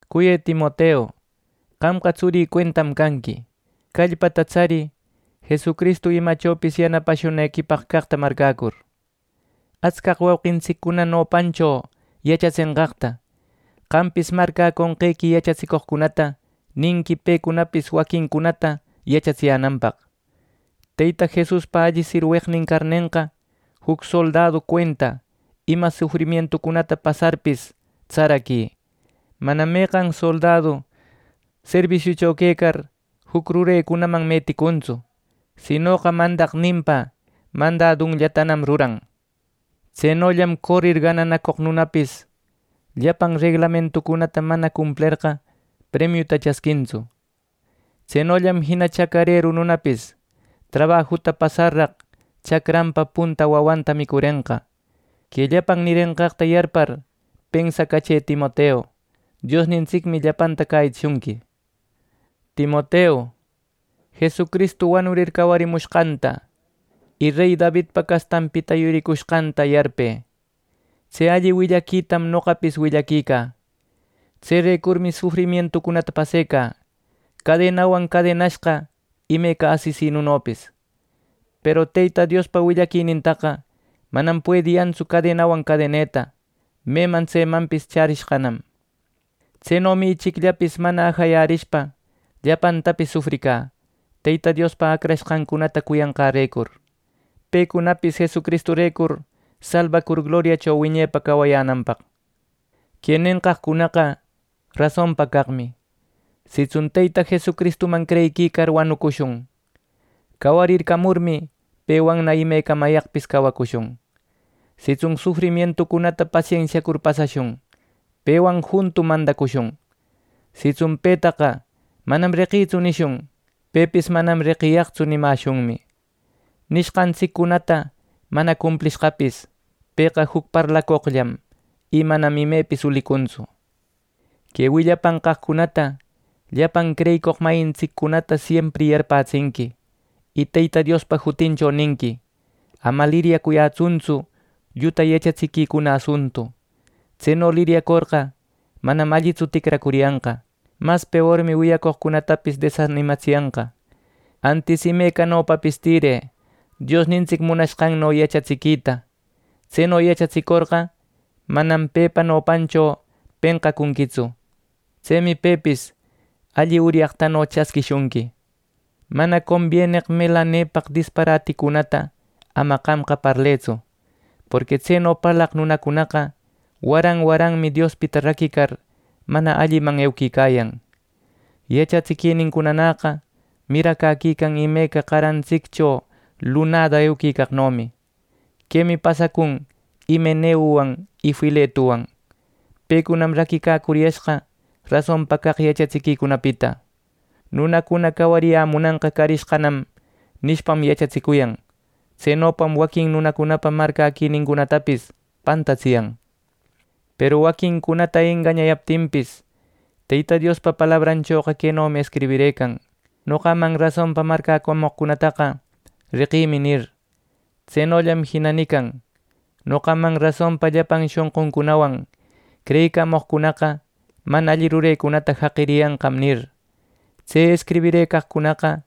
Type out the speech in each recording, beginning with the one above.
Cuyë Timoteu, qamqa tsurï cuentam canqui. Callpata tsarï Jesucristu imachopis yanapashunequipaq caqta marcäcur. Atscaq wauqintsiccuna nopancho yachatsenqaqta, qampis marcäconqequi yachatsicoqcunata ninqui pecunapis waquincunata yachatsiyänanpaq. Teyta Jesuspa alli sirweqnin carnenqa, juc soldadu cuenta, ima sufrimientucunata pasarpis tsaraquï. Manam meqan soldadu serbisiucho quecar juc rurecunaman meticunnatsu; sinoqa mandaqninpa mandadunllatanam ruran. Tsenollam corir gananacoq nunapis, llapan reglamentucunata mana cumplerqa premiuta chasquintsu. Tsenollam jina chacareru nunapis trabajuta pasarraq chacranpa punta wawanta micurenqa. Que llapan nirenqaqta yarpar pensacachë, Timoteu. Diosnintsicmi llapanta cäyitsishunqui. Timoteu, Jesucristu wanurir cawarimushqanta, y rey Davidpa castanpita yuricushqanta yarpë. Tse alli willaquitam noqapis willaquicä. Tserecurmi sufrimientucunata pasecä cadenawan cadenashqa, imeca asesinunopis; peru Teyta Diospa willaquinintaqa manam puediyantsu cadenawan cadeneta; meman tsemanpis chärishqanam. Tsenomi ichicllapis mana ajayarishpa llapantapis sufricä Teyta Diospa acrashqancunata cuyanqarecur, pecunapis Jesucristurecur salbacur gloriacho wiñepa cawayänanpaq. Que nenqaqcunaqa rasonpa caqmi: Sitsun Teyta Jesucristuman creyiquicar wanushun; cawarircamurmi, pewanna imecamayaqpis cawacushun. Sitsun sufrimientucunata pasensiacur pasashun; pewan juntum mandacushun. Sitsun “Petaqa manam reqïtsu” nishun; pepis “Manam reqiyaqtsu” nimäshunmi. Nishqantsiccunata mana cumplishqapis, Pëqa juc parlacoqllam, y manam imepis ulicuntsu. Que willapanqaqcunata llapan creyicoq mayintsiccunata siempri yarpätsinqui, y Teyta Diospa jutincho ninqui: Ama liryacuyätsuntsu lluta yachatsiquicuna asuntu. Tseno liryacorqa, manam allitsu ticracuriyanqa; mas peormi wiyacoqcunatapis desanimatsiyanqa. Antis imecanopapis tirë Diosnintsic munashqanno yachatsiquita. Tseno yachatsicorqa manam pepa nopancho penqacunquitsu; tsemi pepis alli uryaqtano chasquishunqui. Mana combieneq melanepaq disparaticunata ama qamqa parlëtsu; porqui tseno parlaq nunacunaqa waran waranmi Diospita raquicar, mana alliman euquicayan. Yachatsiquinincunanäqa miracäquican imeca qarantsiccho lunada euquicaqnomi. Quemi pasacun Himeneuwan y Filetuwan. Pecunam raquicacuriyashqa rasonpa caq yachatsiquicunapita “Nunacuna cawariyämunanqa carishqanam” nishpam, yachatsicuyan. Tsenopam waquin nunacunapa marcäquinincunatapis pantatsiyan. Peru waquincunata engañayaptinpis, Teyta Diospa palabranchoqa quenomi escribirëcan: “Noqaman rasonpa marcäcamoqcunataqa, reqïmi” nir. Tsenollam jina nican: “Noqaman rasonpa llapan shonquncunawan creyicamoqcunaqa mana alli rurecunata jaqiriyanqam” nir. Tse escribirëcaqcunaqa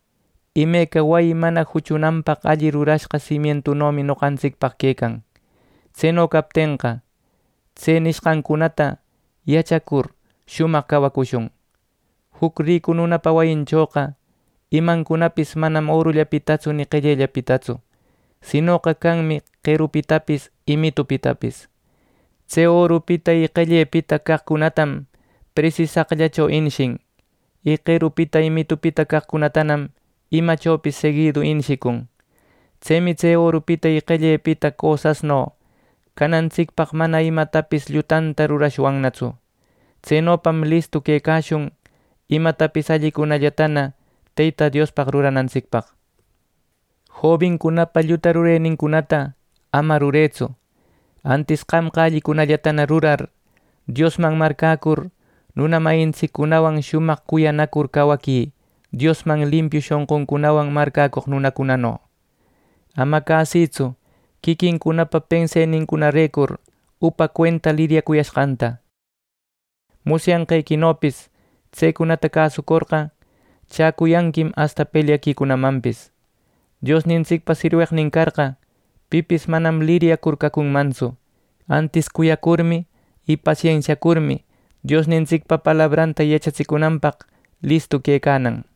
imeca wayi mana juchunanpaq alli rurashqa simientunomi noqantsicpaq quecan. Tseno captenqa, tse nishqancunata yachacur shumaq cawacushun. Juc ricu nunapa wayinchoqa imancunapis manam orullapitatsu ni qellellapitatsu; sinoqa canmi qerupitapis y mitupitapis. Tse orupita y qellepita caqcunatam presisaqllacho inishin; y qerupita y mitupita caqcunatanam imachopis seguidu inishicun. Tsemi tse orupita y qellepita cosasno canantsicpaq mana imatapis llutanta rurashwannatsu. Tsenopam listuna quecashun imatapis allicunallatana Teyta Diospaq ruranantsicpaq. Jobincunapa lluta rurenincunata ama rurëtsu. Antis qamqa allicunallata rurar, Diosman marcäcur, nuna mayintsiccunawan shumaq cuyanacur cawaquï, Diosman limpiu shonquncunawan marcäcoq nunacunano. Ama cäsïtsu quiquincunapa pensenincunarecur upa cuenta liryacuyashqanta. Musyanqequinopis, tsecunata cäsucorqa chäcuyanquim asta pelyaquicunamanpis. Diosnintsicpa sirweqnin carqa, pipis manam liryacur cacunmantsu. Antis cuyacurmi y pasensiacurmi, Diosnintsicpa palabranta yachatsicunanpaq listu quecanan.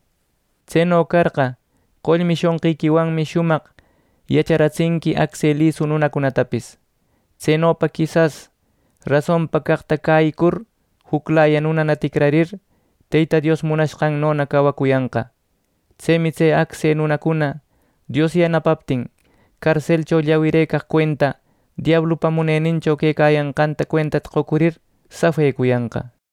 Tseno carqa qollmi shonqiquiwanmi shumaq yacharatsinqui acse lisu nunacunatapis. Tsenopa quisas rasonpa caqta cäyicur juclaya nunana ticrarir, Teyta Dios munashqannona cawacuyanqa. Tsemi tse acse nunacuna, Dios yanapaptin carselcho llawirëcaq cuenta diablupa munenincho quecayanqanta cuentata qocurir, safecuyanqa.